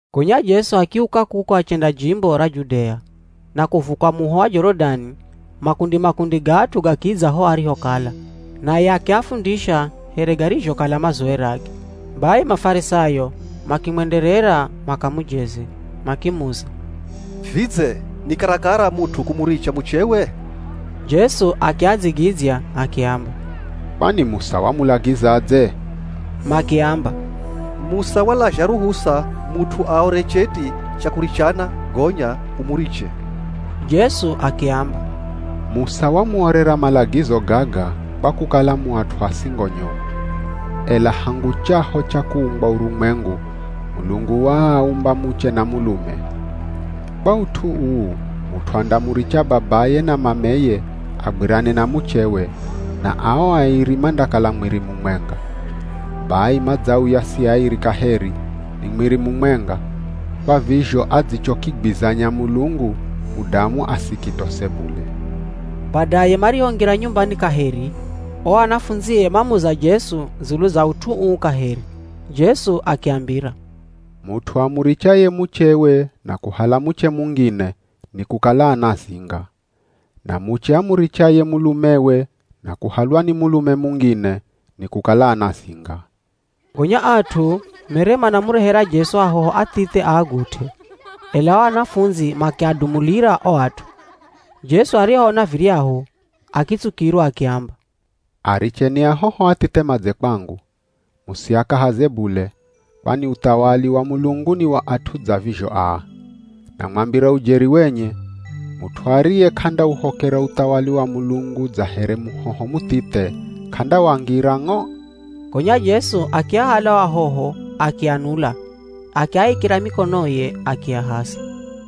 Gonya Jesu akiuka kuko achenda jimbo ra Judea, na kuvuka muho wa Jorodani. Makundi-makundi ga at'u gakidza ho arihokala. Naye akiafundisha here garizhokala mazowerage. Bai Mafarisayo makimwenderera makamujeze, makimuza, “Vidze ni karakara mut'u kumuricha muchewe?” Jesu akiadzigidzya akiamba, “Kwani Musa wamulagizadze?” Makiamba, “Musa walazha ruhusa mut'u aore cheti cha kurichana gonya umuriche.” Jesu akiamba, “Musa wamuorera malagizo gaga kwa kukala mu at'u a singo nyomu. Ela hangu chaho cha kuumbwa urumwengu, ‘Mulungu waaumba muche na mulume.’ Kwa ut'u uu mut'u andamuricha babaye na mameye agwirane na muchewe, na ao airi mandakala mwiri mumwenga. Bai madzauya si airi kaheri, ni mwiri mumwenga. Kwa vizho adzichokigwizanya Mulungu, mudamu asikitose bule.” Badaye marihongira nyumbani kaheri, o anafundzie mamuza Jesu dzulu za ut'u uu kaheri. Jesu akiambira, “Mut'u amurichaye muchewe na kuhala muche mungine nikukala anazinga. Na muche amurichaye mulumewe na kuhalwa ni mulume mungine nikukala anazinga.” Gonya at'u mere manamurehera Jesu ahoho athithe aagut'e, ela o anafundzi makiadumulira o at'u. Jesu arihoona viryahu, akitsukirwa akiamba, “Aricheni ahoho athithe madze kwangu, musiakahaze bule, kwani uthawali wa Mulungu ni wa at'u dza vizho aa. Namwambira ujeri wenye, mut'u ariye k'andauhokera uthawali wa Mulungu dza here muhoho muthithe, k'andawangira ng'o.” Gonya Jesu akiahala o ahoho akianula, akiaikira mikonoye akiahasa.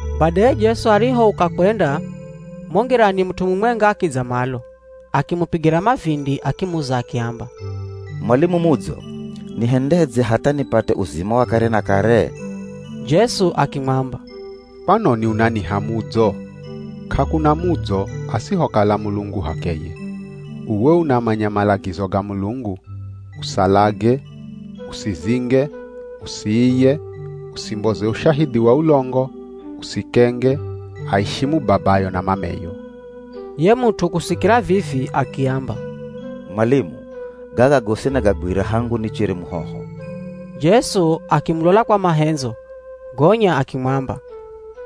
Badaye Jesu arihouka kwenda mo ngirani, mut'u mumwenga akidza malo, akimupigira mavindi akimuza akiamba, “Mwalimu mudzo, nihendedze hatha nipate uzima wa kare na kare?” Jesu akimwamba, “Kwanoni unaniha mudzo? K'akuna mudzo, asihokala Mulungu h'akeye. Uwe unamanya malagizo ga Mulungu: Usalage, usizinge, usiiye, usimboze ushahidhi wa ulongo, usikenge, aishimu babayo na mameyo.” Ye mut'u kusikira vivi akiamba, “Mwalimu, gaga gosi nagagwira hangu nichere muhoho.” Jesu akimulola kwa mahendzo, gonya akimwamba,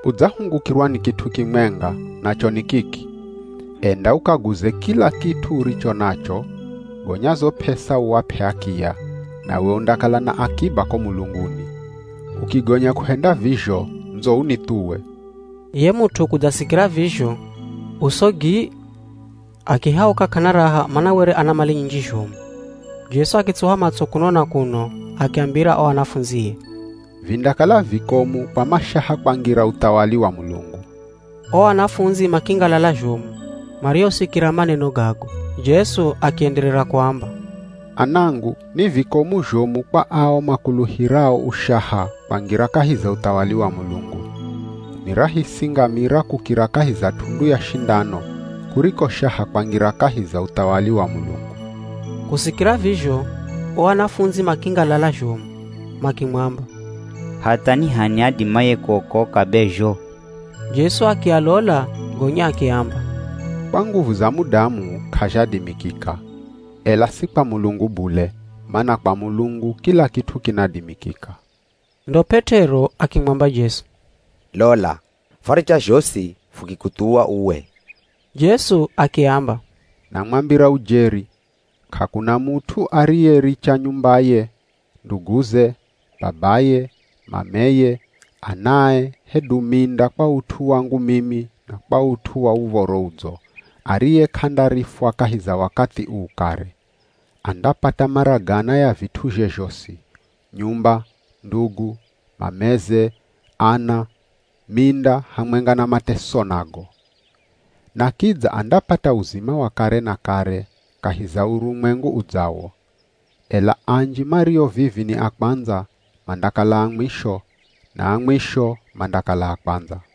“Udzahungukirwa ni kit'u kimwenga nacho ni kiki. Enda ukaguze kila kit'u uricho nacho, gonya zo p'esa uap'e akiya, nawe undakala na akiba ko mulunguni. Ukigonya kuhenda vizho ndzo unithuwe.” Ye mut'u kudzasikira vizho, uso gii, akihauka k'ana raha mana were ana mali nyinji zhomu. Jesu akitsuha matso kuno na kuno, akiambira o anafundzie, “Vindakala vikomu kwa mashaha kwangira uthawali wa Mulungu.” O anafundzi makingalala zhomu marihosikira maneno gago. Jesu akienderera kuamba, “Anangu ni vikomu zhomu kwa ao makuluhirao ushaha kwangira kahi za uthawali wa Mulungu. Ni rahisi ngamira kukira kahi za t'undu ya shindano, kuriko shaha kwangira kahi za uthawali wa Mulungu.” Kusikira vizho, o anafundzi makingalala zhomu, makimwamba, “Hatha ni h'ani adimaye kuokoka be zho?” Jesu akialola gonya akiamba, “Kwa nguvu za mudamu k'azhadimikika, ela si kwa Mulungu bule, mana kwa Mulungu kila kit'u kinadimikika.” Ndo P'et'ero akimwamba Jesu, “Lola, fwaricha zhosi fukikuthuwa uwe.” Jesu akiamba, “Namwambira ujeri, k'akuna mut'u ariyericha nyumbaye, nduguze, babaye, mameye, anae hedu minda kwa ut'u wangu mimi na kwa ut'u wa Uv̱oro Udzo, ariye k'andarifwa kahi za wakathi uu kare. Andapata mara gana ya vit'uzhe zhosi: nyumba, ndugu, mameze, ana, minda hamwenga na mateso nago. Na kidza andapata uzima wa kare na kare kahi za urumwengu udzawo. Ela anji mario vivi ni a kwandza, mandakala a mwisho, na a mwisho, mandakala a kwandza.”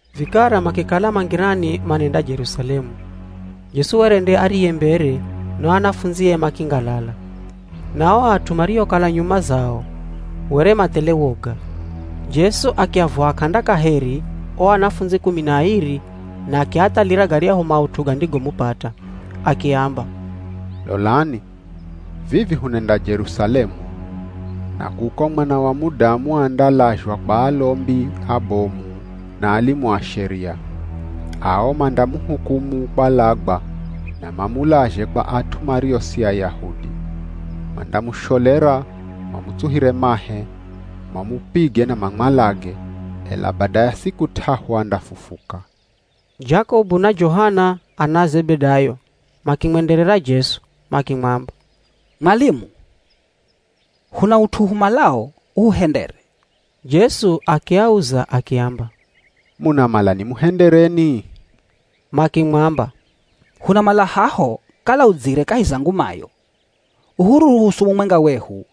Vikara makikala ma ngirani manenda Jerusalemu. Jesu were nde ariye mbere na o anafundzie makingalala, na ao at'u mariokala nyuma zao were mathele woga. Jesu akiavuha k'anda kaheri o anafundzi kumi na airi na akiathalira garyahu maut'u gandigomupata. Akiamba, “Lolani, vivi hunenda Jerusalemu. Na kuko Mwana wa Mudamu andalazhwa kwa alombi abomu na alimu a Sheria. Ao mandamuhukumu kwalagwa na mamulazhe kwa at'u mario si Ayahudi. Mandamusholera mamutsuhire mahe, mamupige na mamwalage, ela bada ya siku t'ahu andafufuka.” Jakobu na Johana ana a Zebedayo makimwenderera Jesu, makimwamba, “Mwalimu, huna ut'u humalao uhuhendere.” Jesu akiauza akiamba, “Munamala nimuhendereni?” Makimwamba, “Hunamala haho kala udzire kahi za ngumayo, uhuruhusu mumwenga wehu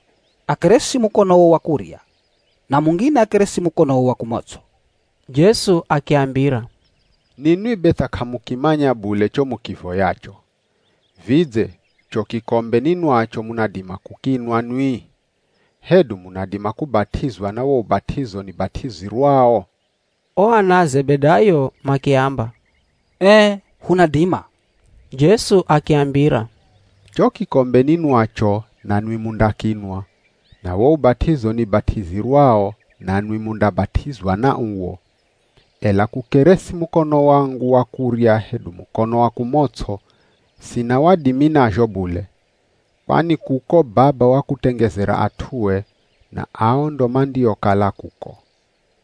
akeresi mukonowo wa kurya na mungine akeresi mukonowo wa kumots'o.” Jesu akiambira, “Ninwi be tha k'amukimanya bule cho mukivoyacho. Vidze cho kikombe ninwacho munadima kukinwa nwi? Hedu munadima kubat'izwa na wo ubat'izo nibat'izirwao?” O ana a Zebedayo makiamba, “Ee hunadima.” Jesu akiambira, “Cho kikombe ninwacho nanwi mundakinwa, na wo ubat'izo nibat'izirwao nanwi mundabat'izwa na uwo. Ela kukeresi mukono wangu wa kurya hedu mukono wa kumots'o, sina wadimi nazho bule. Kwani kuko Baba wakutengezera at'ue, na ao ndo mandiokala kuko.”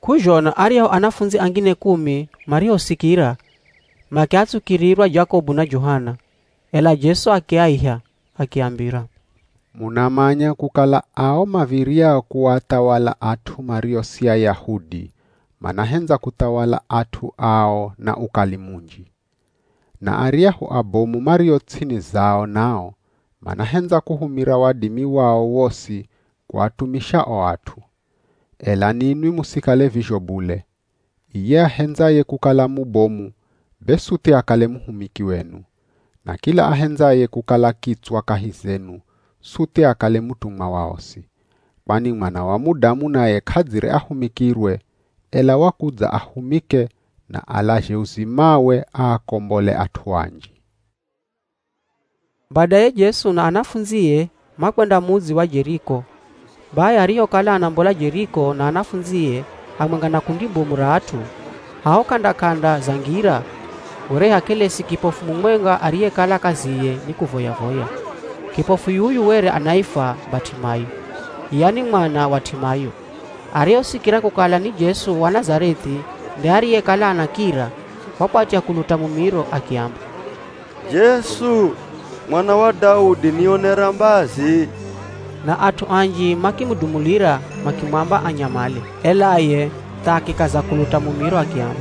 K'uzhona aryahu anafundzi angine kumi marihosikira, makiatsukirirwa Jakobu na Johana. Ela Jesu akiaiha, akiambira, “Munamanya kukala ao mav̱iryao kuathawala at'u mario si Ayahudi manahendza kuthawala at'u ao na ukali munji. Na aryahu abomu mario ts'ini zao nao, manahendza kuhumira wadimi wao wosi kuatumisha o at'u. Ela ninwi musikale vizho bule. Iye ahendzaye kukala mubomu be suthi akale muhumiki wenu. Na kila ahendzaye kukala kitswa kahi zenu suthi akale mutumwa wa osi. Kwani Mwana wa Mudamu naye k'adzire ahumikirwe, ela wakudza ahumike na alazhe uzimawe aakombole at'u anji.” Badaye Jesu na anafundzie makwenda mudzi wa Jeriko. Bai arihokala anambola Jeriko na anafundzie hamwenga na kundi bomu ra at'u, haho k'anda-k'anda za ngira, were hakelesi kipofu mumwenga ariyekala kaziye ni kuvoya-voya. Kipofu yuyu were anaifwa Bat'imayo, yani mwana wa T'imayo. Arihosikira kukala ni Jesu wa Nazareth'i nde ariyekala anakira, wakwatya kuluta mumiro akiamba, “Jesu mwana wa Daudi, nionera mbazi!” Na at'u anji makimudumulira makimwamba anyamale, ela ye tha akikaza kuluta mumiro akiamba,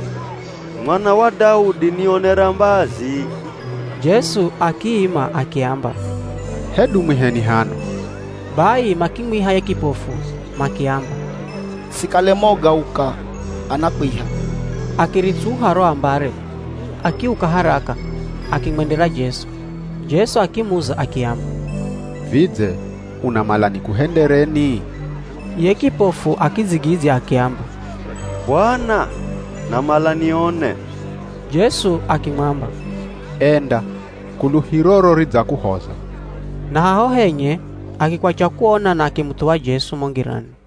“Mwana wa Daudi, nionera mbazi!” Jesu akiima akiamba, “Hedu mwiheni hano.” Bai makimwiha ye kipofu makiamba, “Sikale moga uka, anakwiha.” Akiritsuha ro ambare, akiuka haraka, akimwendera Jesu. Jesu akimuza akiamba, “Vidze unamala nikuhendereni?” Ye kipofu akidzigidzya akiamba, “Bwana, namala nione!” Jesu akimwamba, “Enda, kuluhiroro ridzakuhoza.” Na haho henye, akikwacha kuona na akimuthuwa Jesu mo ngirani.